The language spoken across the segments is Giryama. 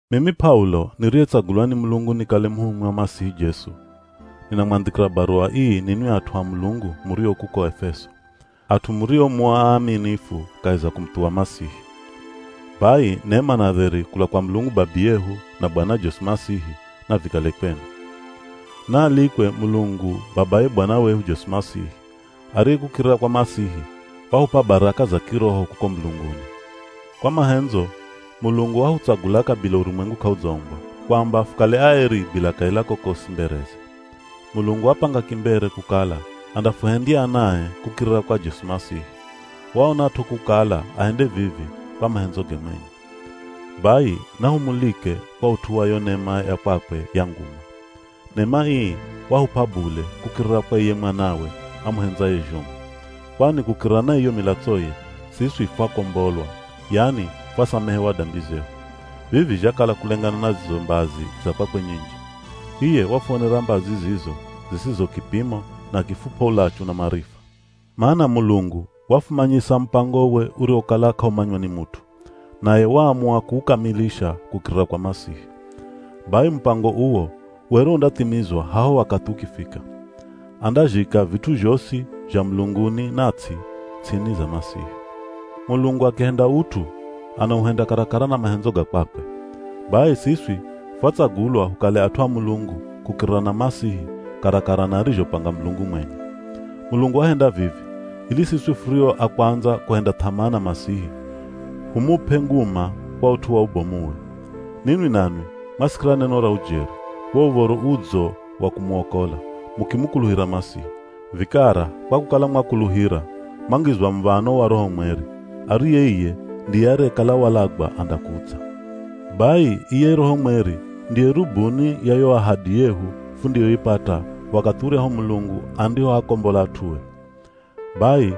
Mimi P'aulo niriyetsagulwa ni Mulungu nikale muhumwi wa Masihi Jesu, ninamwandhikira baruwa ii ninwi at'u a Mulungu murio kuko Efeso, at'u murio mu aaminifu kahi za kumuthuwa Masihi. Bai nema na dheri kula kwa Mulungu Babiyehu na Bwana Jesu Masihi navikale kwenu. Naalikwe Mulungu babaye Bwana wehu Jesu Masihi, ariye kukirira kwa Masihi, wahup'a baraka za kiroho kuko mulunguni. Kwa mahendzo, Mulungu wahutsagula kabila urumwengu k'audzaumbwa, kwamba fukale aeri bila kaila kokosi mbereze. Mulungu wapanga kimbere kukala andafuhendya anae kukirira kwa Jesu Masihi. Waonat'o kukala ahende vivi kwa mahendzoge mwenye. Bai nahumulike kwa ut'u wa yo nema ya kwakwe ya nguma. Nema ii wahup'a bule kukirira kwa iye Mwanawe amuhendzaye zhomu. Kwani kukirira na iyo milatsoye, siswi fwakombolwa, yani fwasamehewa dambi zehu. Vivi zhakala kulengana na zizo mbazi za kwakwe nyinji. Iye wafuonera mbazi zizo zisizo kipimo na akifup'a ulachu na marifa. Mana Mulungu wafumanyisa mupangowe uriwokala k'aumanywa ni mut'u, naye waamua kuukamilisha kukirira kwa Masihi. Bai mupango uwo were undathimizwa haho wakathi ukifika. Andazhika vit'u zhosi, zha mulunguni na ts'i, ts'ini za Masihi. Mulungu akihenda ut'u, anauhenda karakara na mahendzo ga kwakwe. Bai siswi fwatsagulwa hukale at'u a Mulungu kukirira na Masihi karakara na arizhopanga Mulungu mwenye. Mulungu wahenda vivi, ili siswi furio a kwandza kuhenda th'amaa na Masihi, humup'e nguma kwa ut'u wa ubomuwe. Ninwi nanwi mwasikira neno ra ujeri, wo Uv̱oro Udzo wa kumuokola, mukimukuluhira Masihi. Vikara kwa kukala mwakuluhira, mwangizwa muv̱ano wa Roho Mweri, ariye iye ndiye ariyekala walagwa andakudza. Bai iye Roho Mweri ndiye rubuni ya yo ahadi yehu fundiyoipata wakathi uryahu Mulungu andihoakombola at'ue. Bai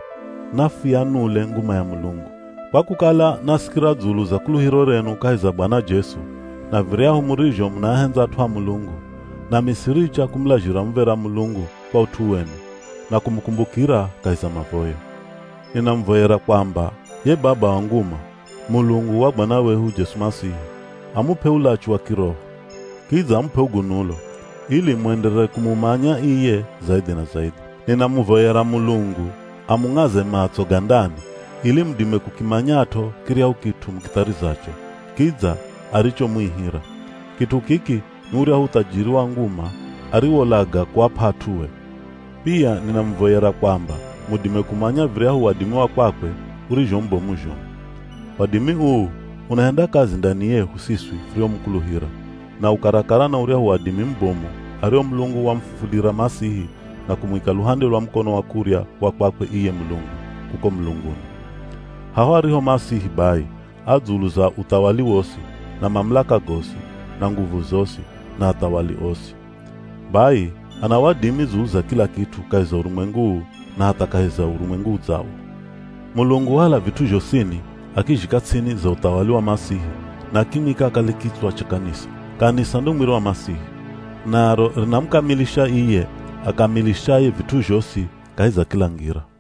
nafuyanule nguma ya Mulungu! Kwa kukala, nasikira dzulu za kuluhiro renu kahi za Bwana Jesu, na viryahu murizho munaahendza at'u a Mulungu, nami siricha kumulazhira muv̱era Mulungu kwa ut'u wenu, na kumukumbukira kahi za mavoyo. Ninamuvoyera kwamba ye Baba wa nguma, Mulungu wa Bwana wehu Jesu Masihi, amup'e ulachu wa kiroho. Kidza amup'e ugunulo, ili muenderere kumumanya iye zaidhi na zaidhi. Ninamuvoyera Mulungu amung'aze matso ga ndani ili mudime kukimanyat'o kiryahu kit'u mukitharizacho, kidza arichomuihira. Kit'u kiki ni uryahu uthajiri wa nguma ariwolaga kuap'a at'ue. Pia ninamuvoyera kwamba mudime kumanya viryahu wadimi wa kwakwe urizho mubomu zhomu. Wadimi uu unahenda kazi ndani yehu siswi furiomukuluhira, na u karakara na uryahu wadimi mubomu ario Mulungu wamufufulira Masihi na kumwika luhande lwa mukono kurya wa kwakwe iye Mulungu, kuko mulunguni. Haho ariho Masihi bai, a dzulu za uthawali wosi, na mamulaka gosi, na nguvu zosi, na athawali osi. Bai ana wadimi dzulu za kila kit'u kahi za urumwengu uu na hatha kahi za urumwengu udzawo. Mulungu wahala vit'u zhosini akizhika ts'ini za uthawali wa Masihi na akimwika akale kitswa cha kanisa. Kanisa ndo mwiri wa Masihi, naro rinamukamilisha iye akamilishaye vit'u zhosi kahi za kila ngira.